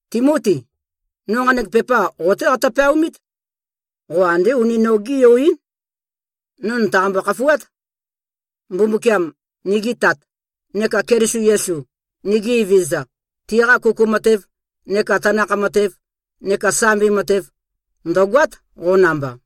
Timoti! No nqanek pepa qo-té qatø-peaomít. Qo andé uni nogé-yo-ín. No nø̀taqambo-khafuát. Mbumbukiam, nigi Tat, neka Keliso Yesu, nigi Evezøza, tiqa kuku matev neka tanakh matev neka sambi matev, ndø̀goát, qo namba.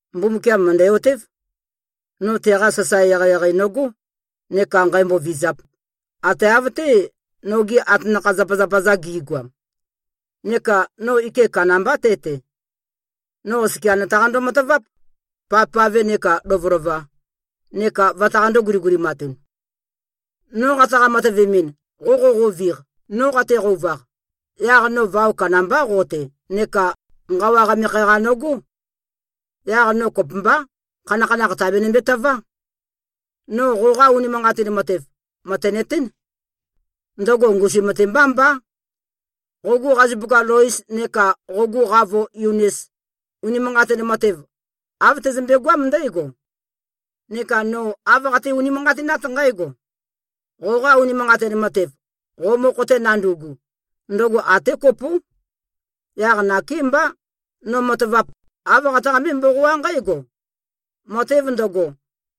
Mbumbukiam mø̀ndæ-otév, no teqa sasae eqeieqei nogó neka nqǣmbō-vīzāp, ate av-té, nogi atanakha-zapazapa-za gi꞉goam. Neka no ike kandambá te-te. No oskia nø̀taqando-mataváp, pavpave nekā lovølova, neka vøtaqandō-guligulimatun. No qataqa-matøvemɨn, qo qoqoviq, no qateqouvaq, yaq no vao kandambá qo-te neka nqawa qamekhe-qa nøgó. Yaq no kopømbá, khanakhanakh tàbenømbe-tøvá. No qoqa unimanqatin matev, mø̀tenøtén. Ndøgo ngusum-te mbá mbá. Qogu qazupuka Lois neka qogu qavo Yunis, unimanqatin matev, av tøzømbe-goám ndǽgo. Neka no āv qate-unimanqatinát nqǽgo: Qoqa unimanqatin matev, qo mokho-te nandu꞉gu, ndøgo até kopó. Yaq nakémbá, no matavap, āv qataqambé-mboqoá nqǽgo: Matev ndøgo,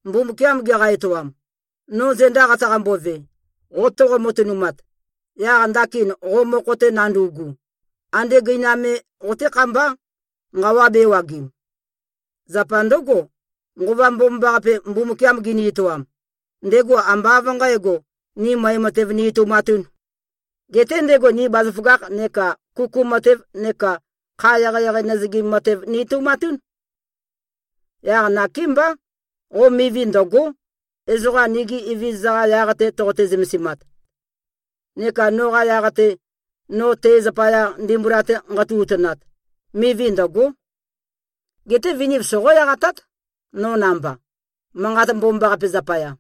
Mbumbukiam geqa-etoam, no zenda qataqambove, qo toqo-matønumat, yaq ndakin qo mokho-te nandu꞉gu, ande gøinam me qoté-khambá, nqawa bēwagim. Zapa ndǿgo, Nqova Mbomambaqape, Mbumbukiam gini-etoam, ndego ambá av nqǣgo, ni møe matev ni-etoumatūn. Geté ndego ni bazaføgakh neka kuku matev neka kha eqeieqei nøzøgim matev ni-etoumatún. Yaq nakémbá, qo mivi ndø̀go᷄, ezoqa nigi Evezøza-qa yaq-te toqote-zømesimat. Neka noqa yaq-te, no te zapaya ndimbula-te nqatu-utønat, mivi ndø̀go᷄. Geté viniv soqó-eqatát, no namba, Manqat Mbomambaqape zapaya.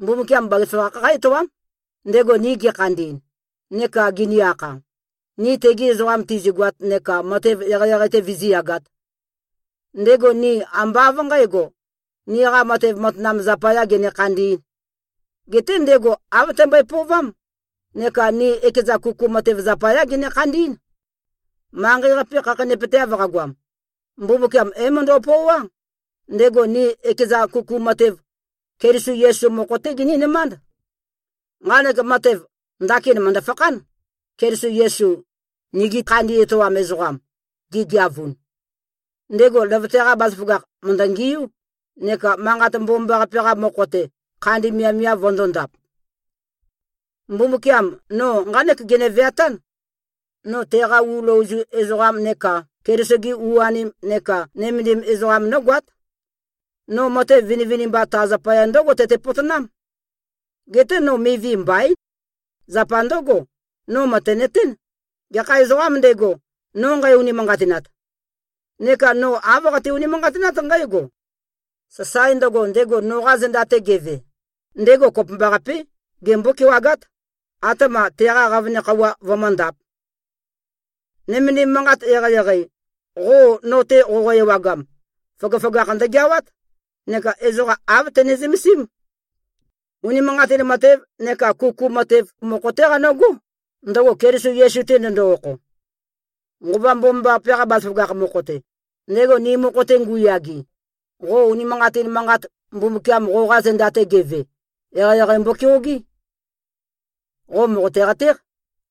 Mbumbukiam bazaføgakh qá-etoám, ndego ni gekhandi꞉n, neka gini-akha, ni tegi ezoqam tizigoat neka matev eqeieqei-te vizíyagāt. Ndego ni ambá av nqǣgo, niqa matev matanam zapayā gene-khandī꞉n. Geté ndego āv tømbøe-pøovám, neka ni ekeza kuku matev zapayá gene-khandí꞉n. Manqei-qape khakheinøpøteav qagoam, Mbumbukiam é-møndo꞉pøoá, ndego ni ekeza kuku matev, Keliso Yesu mokho-té ginínømánd. Nqanek matev, ndakin mø̀ndø-fakhán, Keliso Yesu, nigi khandi etoam ezoqam, gegeavun. Ndego løvøte-qa bazaføgakh mø̀ndøngiú neka Manqat Mbomambaqape-qa mokho-te, khandi miavmiav vøndōndap. Mbumbukiam no nqánek gene-veatán: No teqa u løozu ezoqam neka Keliso-ge u-anem neka nømendim ezoqam nógoát. No matev vinivinimba ta zapaya ndǿgo tøte-potonám. Geté no mivi mbaín. Zapa ndǿgo, no mø̀tenøtén, gekha ezoqām ndego, no nqæ-unimanqatinat. Neka no āv qate-unimanqatinát nqǽgo: Sasae ndøgo, ndego noqa zenda-te geve, ndego kopømbaqapé, gembó-kewagát, atema teqa qavøne khøuwa vømǿndāp. Nømendim manqat eqeieqei, qo no-te qoqo-ewagam, føgøføgakh ndøgeawát neka ezoqa āv tøne-zømesím. Unimanqatin matev neka kuku matev mokho-té qonǿgó, ndøgo Keliso Yesu-te ndøndo-okho. Nqova Mbomambaqape-qa bazaføgakh mokho-te, ndego ni mokho-te ngu꞉yage, qo unimanqatin manqat, Mbumbukiam qoqa zenda-te geve, eqeieqei mbokeogé. Qo mòqote-qatéq,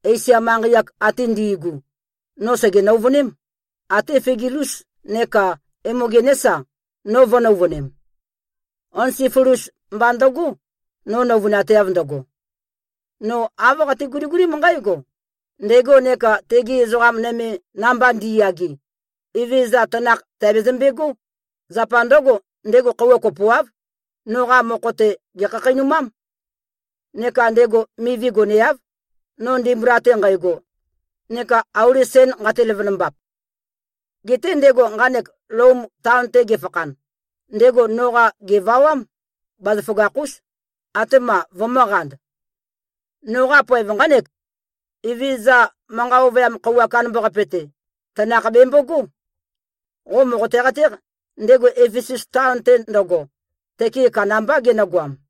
Esia manqei-ak ate ndi꞉gu, no sège-nøuvøném, até Figelus neka Emogenés-a, no vø̄-nøuvønem. Onesifolus mba ndøgó, no nøuvønateav ndøgo. No āv qate-guligulím nqǽgo: Ndego neka tegi ezoqa nøme, namba ndi꞉yage, Evezøza tanakh tèabezømbegó. Zapa ndǿgo, ndego khøuwa kopoáv, noqa mokho-te, gèkhakheinumám. Neka ndego mivi goneáv, no ndimbula-te nqægo neka auli sen nqate-løvønømbap. Geté ndego nqanek Lom taon-te gefakhan, ndego noqa, gèvawám, bazaføgakh-ús, atema vømø̄qand. Noqa poev nqánek: Evezøza manqa ovøyam khøuwa kandambaqape-te, tanakh bèmbogó. Qo mòqote-qatéq, ndego Efesus taon-te ndøgo, tøke kandambá genøgoam.